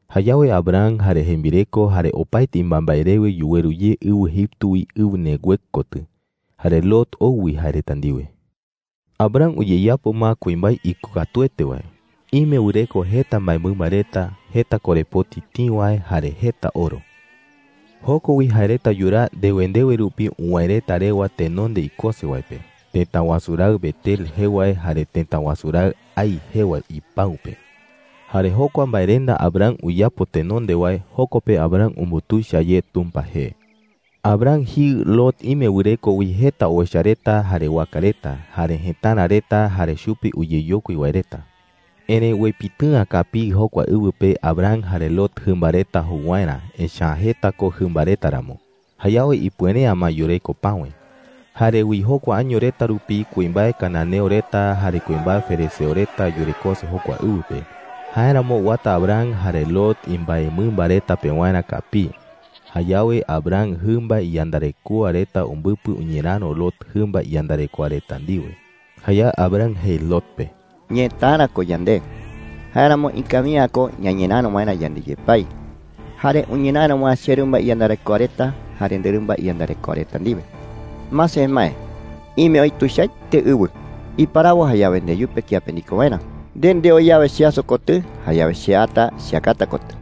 Jayawe Abram jare jembireko jare opaete imbaembae rewe yuweru ye ɨwɨ Egipto wi ɨwɨ Neguev kotɨ. Jare Lot ou wi jae reta ndiwe. Abram uyeyapo ma kuimbae ikokatuete wae. Ime wɨreko jeta mbaemɨmba reta, jeta korepoti tïi wae, jare jeta oro. Joko wi jae reta yuraa ndewe ndewe rupi uwäe reta rewa tenonde ikose wae pe, tëta wasu raɨ Betel jee wae jare tëta wasu raɨ Hai jee wae ipäu pe. Jare jokua mbaerenda Abram uyapo tenonde wae, joko pe Abram umbutuicha ye Tumpa jee. Abram jiɨ Lot ime wɨreko wi jeta owecha reta jare waka reta, jare jëtara reta jare chupe uyeyokui wae reta. Erëi uepitɨ'ä kapii jokua ɨwɨ pe Abram jare Lot jɨmba reta jou waerä, echa’ä jeta ko jɨmba reta ramo. Jayawe ipuere’ä ma yureko päwe. Jare wi jokua año reta rupi kuimbae cananeo reta jare kuimbae ferezeo reta yurekose jokua ɨwɨ pe. Jáeramo uata Abram jare Lot imbaemɨmba reta pewarä kapii. Jayawe Abram jɨmba iyandarekoa reta umbɨpɨ uñeräro Lot jɨmba iyandarekoa reta ndiwe. Jayawe Abram jei Lot pe: “Ñëtara ko yande. Jáeramo ikawi’ä ko ñañeräro waerä yande yepái jare uñeräro waerä cherɨmba iyandarekoa reta jare nderɨmba iyandarekoa reta ndiwe,” jei. “Mase, emae. Ime oï tuichaete ɨwɨ. Iparawo jayawe ndeyupe kiape ndiko waerä. Nde ndeo yawe cheaso kotɨ, jayawe che ata cheakata kotɨ.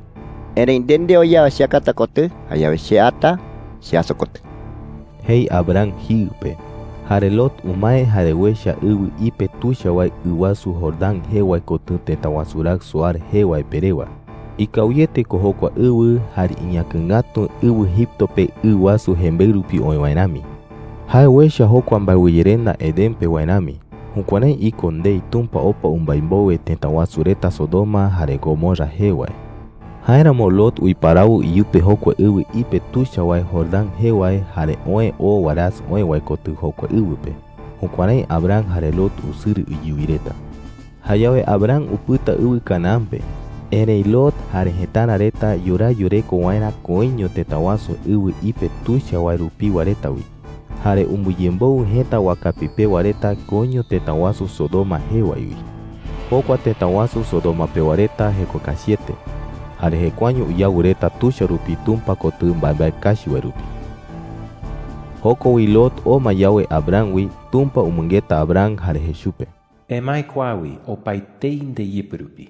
Erëi nde ndeo yawe cheakata kotɨ, jayawe che ata cheaso kotɨ,” jei Abram jiɨ pe. Jare Lot umae jare uecha ɨwɨ ipe tuicha wae ɨ wasu Jordán jee wae kotɨ tëta wasu raɨ Zoar jee wae pe rewa. Ikawiete ko jokua ɨwɨ, jare iñäkɨ ngatu ɨwɨ Egipto pe ɨ wasu jembeɨ rupi ɨwɨ oï wae rami. Jae uecha jokua mbaewɨyerenda Edén pe wae rami. Jukuärái iko ndei Tumpa opa umbái mbowe tëta wasu reta Sodoma jare Gomorra jee wae. Jáeramo Lot uiparawo iyupe jokua ɨwɨ ipe tuicha wae Jordán jee wae, jare oë oo warasɨ oë wae kotɨ jokua ɨwɨ pe. Jukuärái Abram jare Lot usɨrɨ iyuwi reta. Jayawe Abram upɨta ɨwɨ Canaán pe. Erëi Lot jare jëtara reta yuraa yureko waerä koiño tëta wasu ɨwɨ ipe tuicha wae rupiwa reta wi. Jare umbɨyemboɨ jëta wakapi pewa reta koiño tëta wasu Sodoma jee wae wi. Jokua tëta wasu Sodoma pewa reta jeko kachiete jare jekuaeño uyawɨ reta tuicha rupi Tumpa kotɨ mbaembae kachi wae rupi. Joko wi, Lot oo ma yawe Abram wi, Tumpa umɨngeta Abram jare jei chupe: “Emae kua wi opaetei ndeyɨpɨ rupi.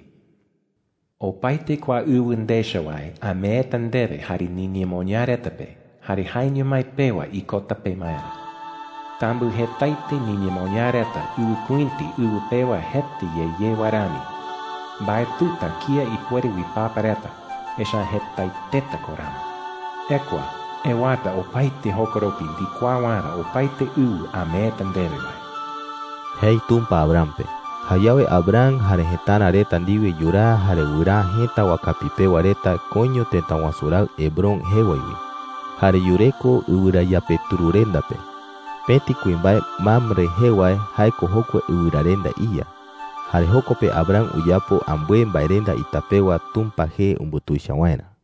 Opaete kua ɨwɨ ndecha wae ameeta ndewe jare niñemoñaa reta pe, jare jaeño mái pewa ikota pemaerä. Tambɨjetaete niñemoñaa reta ɨwɨkuïti ɨwɨ pewa jeta ye ye wae rami. Mbaetɨta kía ipuere uipapa reta, echa’ä jetaeteta ko ramo. Ekua, ewata opaete jokoropi ndikuaa waerä opaete ɨwɨ ameeta ndewe wae,” jei Tumpa Abram pe. Jayawe Abram jare jëtara reta ndiwe yuraa jare wɨraa jëta wakapi pewa reta koiño tëta wasu raɨ Hebrón jee wae wi. Jare yureko ɨwɨrayapetururenda pe. Pëti kuimbae Mamre jee wae, jae ko jokua ɨwɨrarenda iya. Jare joko pe Abram uyapo ambɨe mbaerenda ita pewa Tumpa jee umbutuicha waerä.